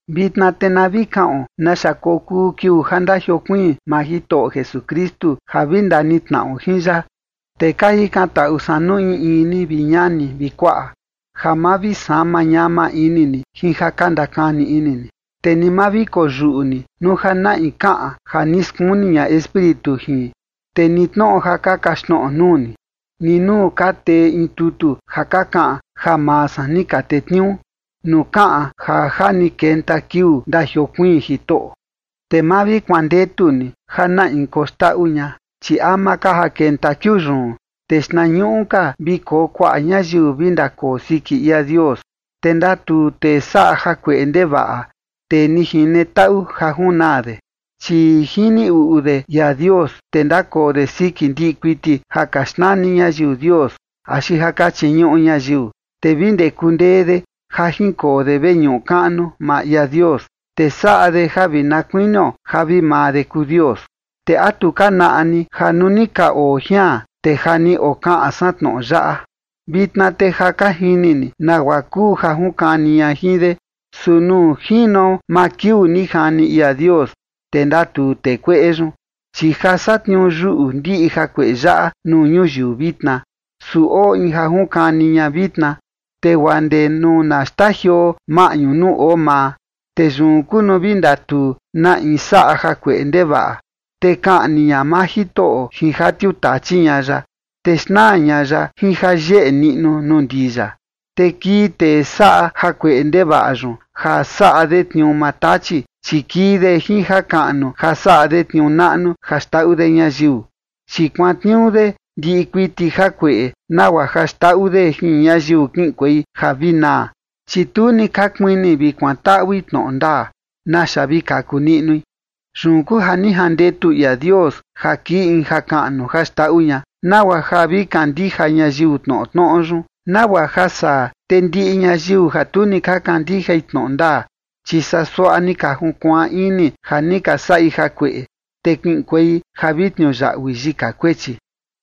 Vitna te na vi kaꞌon naxa kokuu kiuu ja ndajiokuiin maa Jitoꞌo Jesukristu ja vi ndanitnaꞌo jin ya. Te ka jikantaꞌu san nuu in in ni, vi ñani vi kuaꞌa, ja ma vi sama ñama ini ni jin ja ka ndakani ini ni, te ni ma vi koyuꞌu ni nuu ja na in kaꞌan ja ni skuni ña Espíritu jin, te ni tnoꞌo ja ka kaxtnoꞌo nuu ni, ni nuu ka tee in tutu ja ka kaꞌan ja maa san ni ka tetniuu, nuu kaꞌan ja ja ni kenta kiuu ndajiokuiin Jitoꞌo. Te ma vi kuandetu ni ja na in koxndaꞌu ña, chi ama ka ja kenta kiuu yun, te xtnañuꞌu ka vi koo kuaꞌa ñayiu vi ndakoo siki ia Dios, te ndatuu tee saꞌa jakueꞌe ndevaꞌa, tee ni jine taꞌu ja junaa de. Chi jini uꞌu de ia Dios, te ndakoo de siki ndiꞌi kuiti ja ka xnani ñayiu dios, axi ja ka chiñuꞌu ñayiu, te vi ndee kundee de ja jinkoo de veñuꞌu kaꞌnu maa ia Dios, te saꞌa de ja vi na kuinio ja vi maa de kuu Dios. ¿Te a tu ka naꞌa ni ja nuu ni ka oo jian, te ja ni okaꞌan san tnoꞌo yaꞌa? Vitna te ja ka jini ni nagua kuu ja junkani ña jin de, su nuu jino maa kiuu ni jani ia Dios, te ndatuu tee kueꞌe yun. Chi ja satniuu yuꞌu ndiꞌi jakueꞌe yaꞌa nuu ñuyiu vitna, su oo in ja junkani ña vitna, te guaa ndee nuu na xtajioo maꞌñu nuu oo maa. Te yun kuu nuu vi ndatuu na in saꞌa jakueꞌe ndevaꞌa, te kaꞌni ña maa Jitoꞌo jin ja tiuu tachi ña ya, te xnaa ña ya jin ja yeꞌe niꞌnu nuu ndii ya. Te kii tee saꞌa jakueꞌe ndevaꞌa yun, ja saꞌa de tniuu maa Tachi, chi kii de jin jakaꞌnu ja saꞌa de tniuu naꞌnu ja xndaꞌu de ñayiu. Chi kuantniuu de ndiꞌi kuiti jakueꞌe nagua ja xndaꞌu de jin ñayiu kiꞌinkuei ja vi naa, chi tu ni ka kuini vi kuantaꞌui tnoꞌo ndaa naxa vi kaku niꞌnui. Yun kuu ja ni jandetu ia Dios ja kii in jakaꞌnu ja xndaꞌu ña, nagua ja vi kandija ñayiu tnoꞌo tnoꞌo yun, nagua ja saa, te ndiꞌi ñayiu ja tu ni ka kandijai tnoꞌo ndaa, chi saa suaꞌa ni ka junkuaan ini ja ni ka saꞌi jakueꞌe, te kiꞌinkuei ja vi tniuyaꞌui yika kuechi.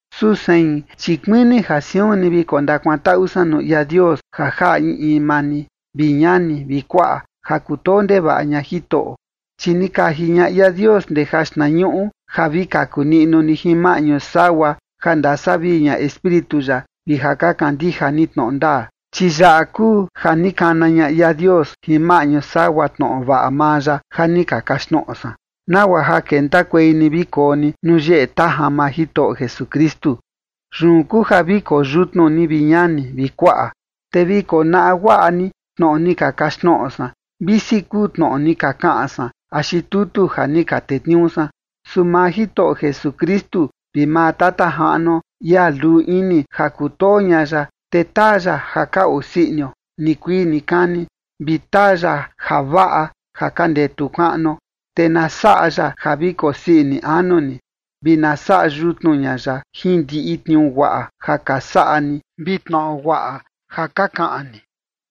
Su sein, chi kuini ja siun ni vi kondakuantaꞌu san nuu ia Dios ja jaꞌa in in maa ni, vi ñani vi kuaꞌa ja kutoo ndevaꞌa ña Jitoꞌo, chi ni kaji ña ia Dios ndee jaxtnañuꞌu ja vi kaku niꞌnu ni jin maꞌñu sagua ja ndasavii ña Espíritu ya vi ja ka kandija ni tnoꞌo ndaa. Chi yaꞌa kuu ja ni kana ña ia Dios jin maꞌñu sagua tnoꞌo vaꞌa maa ya ja ni ka kaxtnoꞌo san, nagua ja kentakuei ni vi koo ni nuu yeꞌe tajan maa Jitoꞌo Jesukristu. Yun kuu ja vi koo yutnu ni, vi ñani vi kuaꞌa, te vi konaꞌa guaꞌa ni tnoꞌo ni ka kaxtnoꞌo san, visi kuu tnoꞌo ni ka kaꞌan san axi tutu ja ni ka tetniuu san. Su maa Jitoꞌo Jesukristu vi maa Tata Jaꞌnuo, ia luu ini ja kutoo ña ya, te taa ya ja ka osii inio nikuii nikani, vi taa ya javaꞌa ja ka ndetu kaꞌnuo. Te na saꞌa ya ja vi kosii ini anu ni vi na saꞌa yutnu ña ya jin ndiꞌi tniuu guaꞌa ja ka saꞌa ni vi tnoꞌo guaꞌa ja ka kaꞌan ni.